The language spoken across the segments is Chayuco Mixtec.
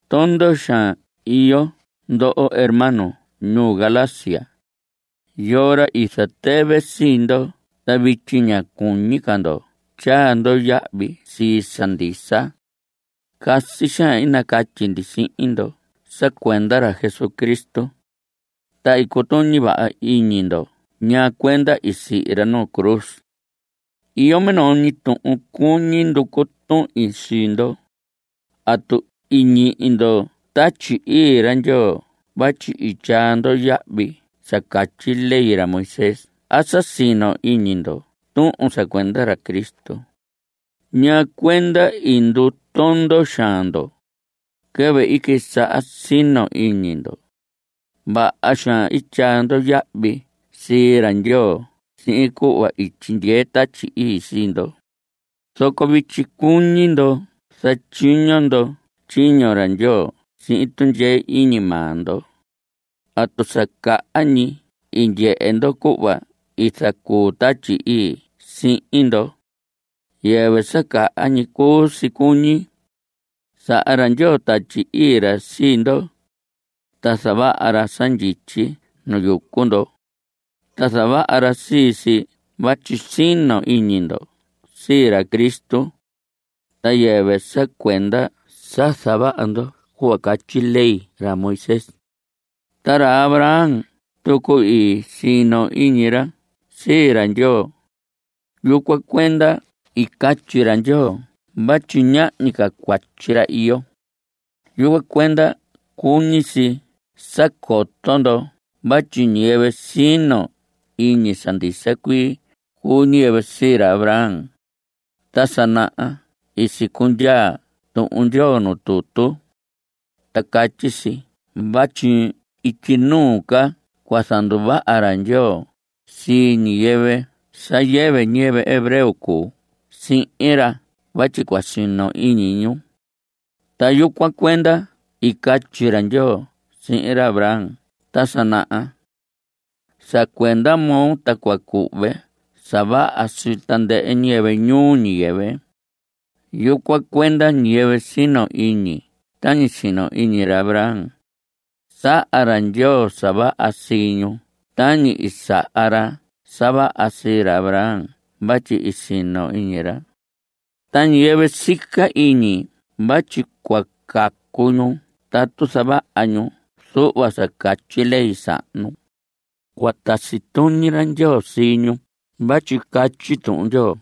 Tondo xaan iyo ndo ndoho hermanos ñuu Galacia. ¿Yoo ra i zatɨvɨ sii ndo ta vityi ña cuñi ca ndo tyaa ndo yahvi sii sa ndisa? Casi xaan i nacatyi ndi sihin ndo sa cuenda ra Jesucristo. Ta i cutuñi vaha iñi ndo ñaa cuenda i sihi ra nu cruz. Iyo minoo ñi tuhun cuñi nducu tuhin sii ndo: ¿Atu i ñihi ndo Tatyi Ii ra Ndyoo vatyi i tyaa ndo yahvi sa catyi ley ra Moisés a sa sino iñi ndo tuhun sa cuenda ra Cristo? ¿Ñaa cuenda i ndutondo xaan ndo? Quɨvɨ i quisaha sino iñi ndo, vaha xaan i tyaa ndo yahvi sii ra Ndyoo sihin cuhva i tyindyee Tatyi Ii sii ndo. Zoco vityi cuñi ndo zatyiño ndo tyiño ra Ndyoo sihin tundyee iñi maa ndo. ¿Atu sa caha ñi i ndyehe ndo cuhva i zacuu Tatyi Ii sihin ndo? Yɨvɨ sa caha ñi cuu si cuñi. Saha ra Ndyoo Tatyi Ii ra sii ndo, ta zavaha ra sa ndyityi nu yucu ndo. Ta zavaha ra sii si vatyi sino iñi ndo sii ra Cristo, ta yɨvɨ sa cuenda sa zavaha ndo cuhva catyi ley ra Moisés. Ta ra Abraham tucu, i sino iñi ra sii ra Ndyoo. Yucuan cuenda i catyi ra Ndyoo vatyi ñahñi ca cuatyi ra iyo. Yucuan cuenda cuñi si sa coto ndo vatyi ñiyɨvɨ sino iñi sa ndisa cuii cuu ñiyɨvɨ sii ra Abraham. Ta sa naha i sicundyaa Tuhun Ndyoo nuu tutu. Ta catyi si vatyi ityi nuu ca cua zanduvaha ra Ndyoo sii ñiyɨvɨ sa yɨvɨ ñiyɨvɨ hebreo cuu sihin ra vatyi cua sino iñi ñu. Ta yucuan cuenda i catyi ra Ndyoo sihin ra Abraham ta sa naha: “Sa cuenda moo ta cua cuhve sa vaha sii tandɨhɨ ñiyɨvɨ ñuu ñiyɨvɨ.” Yucuan cuenda, ñiyɨvɨ sino iñi tañi sino iñi ra Abraham, saha ra Ndyoo sa vaha sii ñu tañi i saha ra sa vaha sii ra Abraham vatyi i sino iñi ra. Ta ñiyɨvɨ sica iñi vatyi cua cacu ñu tatu zavaha ñu zuhva sa catyi ley sahnu, cua tasi tuñi ra Ndyoo sii ñu vatyi catyi Tuhun Ndyoo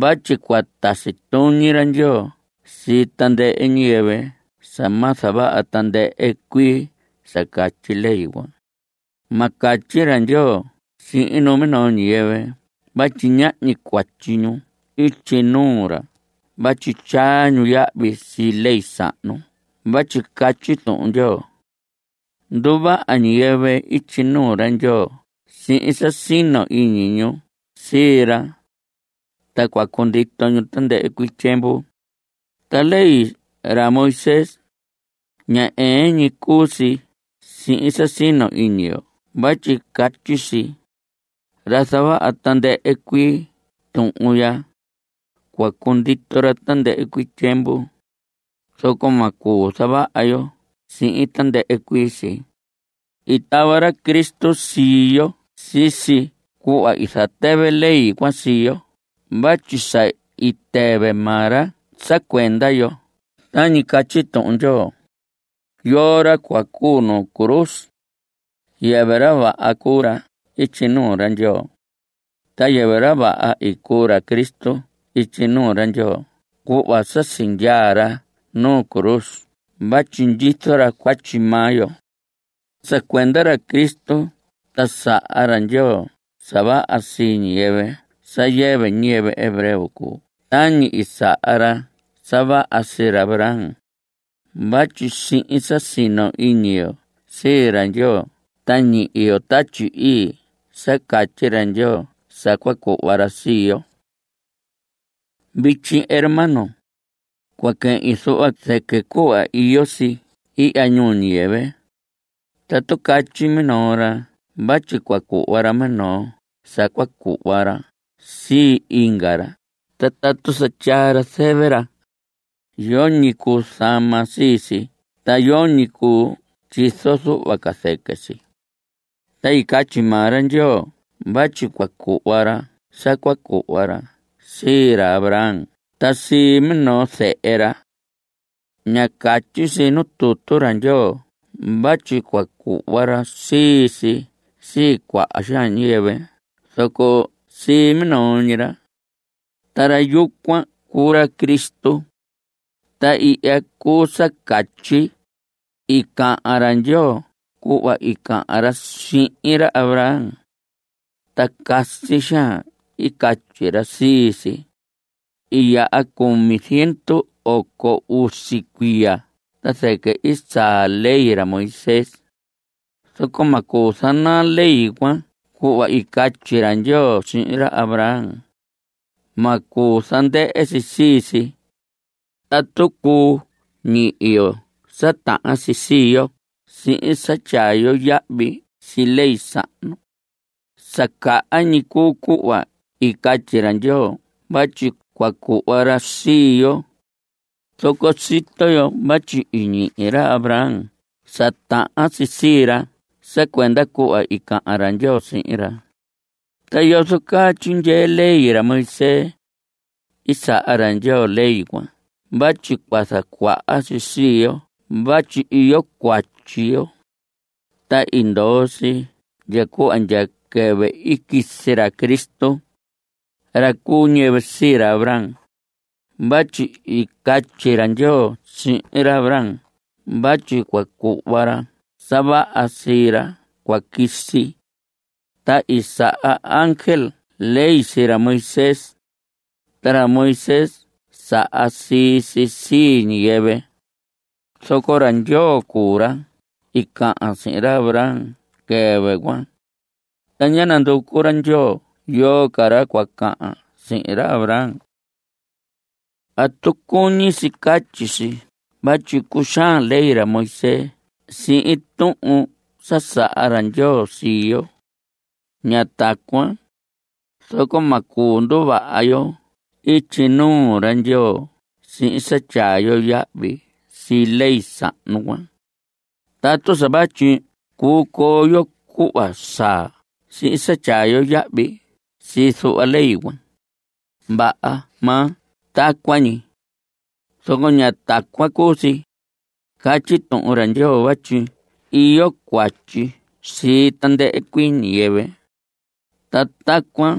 vatyi cua tasi tuñi ra Ndyoo sii tandɨhɨ ñiyɨvɨ sa ma zavaha tandɨhɨ cuii sa catyi ley cuan. Ma catyi ra Ndyoo sihin numinoo ñiyɨvɨ vatyi ñahñi cuatyi ñu ityi nuu ra vatyi tyaa ñu yahvi sii ley sahnu vatyi catyi Tuhun Ndyoo: “Nduvaha ñiyɨvɨ ityi nuu ra Ndyoo sihin sa sino iñi ñu sii ra. Ta cua cundito ñu tandɨhɨ cuii tyiemvu.” Ta ley ra Moisés, ña ɨɨn ñi cuu si sihin sa sino iñi yo vatyi catyi si: “Ra zavaha tandɨhɨ cuii tuhun ya, cua cundito ra tandɨhɨ cuii tyiemvu.” (Zoco ma cuu zavaha yo sii tandɨhɨ cuii si.) I tava ra Cristo sii yo sisi cuhva i zatɨvɨ ley cuan sii yo vatyi sa i tɨvɨ maa ra sa cuenda yo tañi catyi Tuhun Ndyoo: “Yoo ra cua cuu nu cruz, yɨvɨ ra vaha cuu ra ityi nuu ra Ndyoo.” Ta yɨvɨ ra vaha i cuu ra Jesús ityi nuu ra Ndyoo cuhva sa sindyaa ra nuu cruz vatyi ndyizo ra cuatyi maa yo. Sa cuenda ra Cristo ta saha ra Ndyoo sa vaha sii ñiyɨvɨ sa yɨvɨ ñiyɨvɨ hebreo cuu tañi i saha ra sa vaha sii ra Abraham. Vatyi sihin sa sino iñi yo sii ra Ndyoo ta ñihi yo Tatyi Ii sa catyi ra Ndyoo sa cua cuhva ra sii yo. Vityi, hermanos, cua quehin zuhva zɨquɨ cuhva iyo si ihya ñuu ñiyɨvɨ. Tatu catyi minoo ra vatyi cua cuhva ra minoo sa cua cuhva ra sii inga ra ta tatu sa tyaa ra zɨvɨ ra, yoñi cuu zama sii si ta yoñi cuu tyizo zuhva ca zɨquɨ si. Ta i catyi maa ra Ndyoo vatyi cua cuhva ra sa cua cuhva ra sii ra Abraham ta sii minoo zehe ra. Ña catyi si nu tutu ra Ndyoo vatyi cua cuhva ra sii si sii cuaha ñiyɨvɨ zoco sii minoo ñi ra. Ta ra yucuan cuu ra Cristo. Ta ihya cuu sa catyi: I cahan ra Ndyoo cuhva i cahan ra sihin ra Abraham, ta casi xaan i catyi ra sii si. I yaha cumi ziendu oco usi cuiya ta zɨquɨ i saa ley ra Moisés. Zoco ma cuu zanaa ley cuan cuhva i catyi ra Ndyoo sihin ra Abraham. Ma cuu zandɨhɨ si sii si. Tatu cuu ñihi yo sa tahan si sii yo sihin sa tyaa yo yahvi sii ley sahnu, sa caha ñi cuu cuhva i catyi ra Ndyoo vatyi cua cuhva ra sii yo. Zoco sito yo vatyi i ñihi ra Abraham sa tahan si sii ra sa cuenda cuhva i cahan ra Ndyoo sihin ra. ¿Ta yozo caa tyindyee ley ra Moisés? I saha ra Ndyoo ley cuan vatyi cua zacuaha si sii yo vatyi iyo cuatyi yo. Ta i ndoo si ndya cuhva ndya quɨvɨ i quisi ra Cristo, ra cu ñiyɨvɨ sii ra Abraham, vatyi i catyi ra Ndyoo sihin Abraham vatyi cua cuhva ra sa vaha sii ra cua quisi. Ta i saha ángel ley sii ra Moisés, ta ra Moisés saha sii si sii ñiyɨvɨ. Zoco ra Ndyoo cuu ra i cahan sihin ra Abraham quɨvɨ cuan, ta ñá nanducu ra Ndyoo yoo ca ra cua cahan sihin ra Abraham. ¿Atu cuñi si catyi si vatyi cuxaan ley ra Moisés sii tuhun sa saha ra Ndyoo sii yo? Ña tacuan. Zoco ma cuu nduvaha yo ityi nuu ra Ndyoo sihin sa tyaa yo yahvi sii ley sahnu cuan. Tatu sa vatyi cuu coo yo cuhva saa sihin sa tyaa yo yahvi sii zuhva ley cuan, vaha maa tacuan ñi. Zoco ña tacuan cuu si. Catyi tutu ra Ndyoo vatyi iyo cuatyi sii tandɨhɨ cuii ñiyɨvɨ. Ta tacuan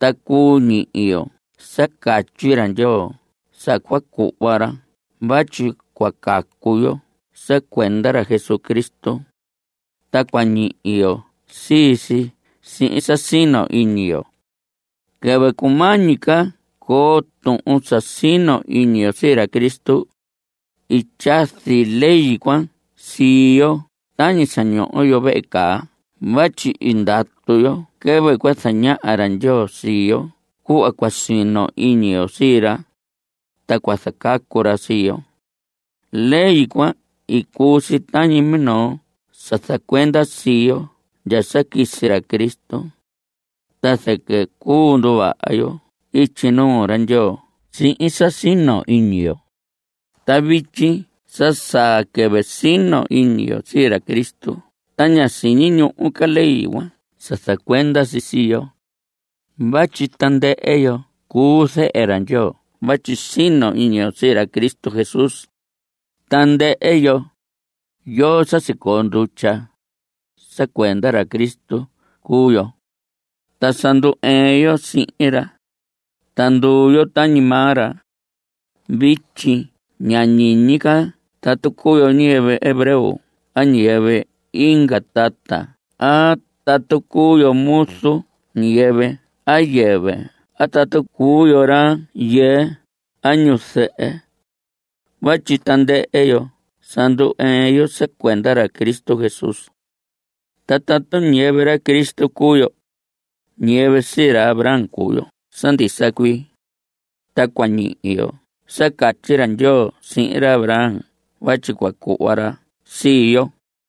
ta cuu ñihi yo sa catyi ra Ndyoo sa cua cuhva ra vatyi cua cacu yo sa cuenda ra Jesucristo. Ta cua ñihi yo sii si sihin sa sino iñi yo. Quɨvɨ cumañi ca coo tuhun sa sino iñi yo sii ra Cristo, i tyazi ley cuan sii yo tañi sa ñoho yo vehe caa vatyi i ndatu yo quɨvɨ cua zañaha ra Ndyoo sii yo cuhva cua sino iñi yo sii ra, ta cua zacacu ra sii yo. Ley cuan i cuu si tañi minoo sa zacuenda sii yo ndya sa quisi ra Cristo, ta zɨquɨ cuu nduvaha yo ityi nuu ra Ndyoo sihin sa sino iñi yo. Ta vityi sa saa quɨvɨ sino iñi yo sii ra Cristo ta ña siñi ñuhu ca ley cuan sa zacuenda si sii yo. Vatyi tandɨhɨ yo cuu zehe ra Ndyoo vatyi sino iñi yo sii ra Cristo Jesús. Tandɨhɨ yo, yo sa sicoo ndutya, sa cuenda ra Cristo cuu yo. Ta sa ndu‑ɨɨn yo sihin ra, ta nduu yo tañi maa ra. Vityi ña ñiñi ca tatu cuu yo ñiyɨvɨ hebreo a ñiyɨvɨ inga tata a tatu cuu yo muzu ñiyɨvɨ a yɨvɨ a tatu cuu yo rayɨɨ a ñuzɨhɨ. Vatyi tandɨhɨ yo sa ndu‑ɨɨn yo sa cuenda ra Cristo Jesús. Ta tatu ñiyɨvɨ ra Cristo cuu yo, ñiyɨvɨ sii ra Abraham cuu yo sa ndisa cuii. Ta cua ñihi yo sa catyi ra Ndyoo sihin ra Abraham vatyi cua cuhva ra sii yo.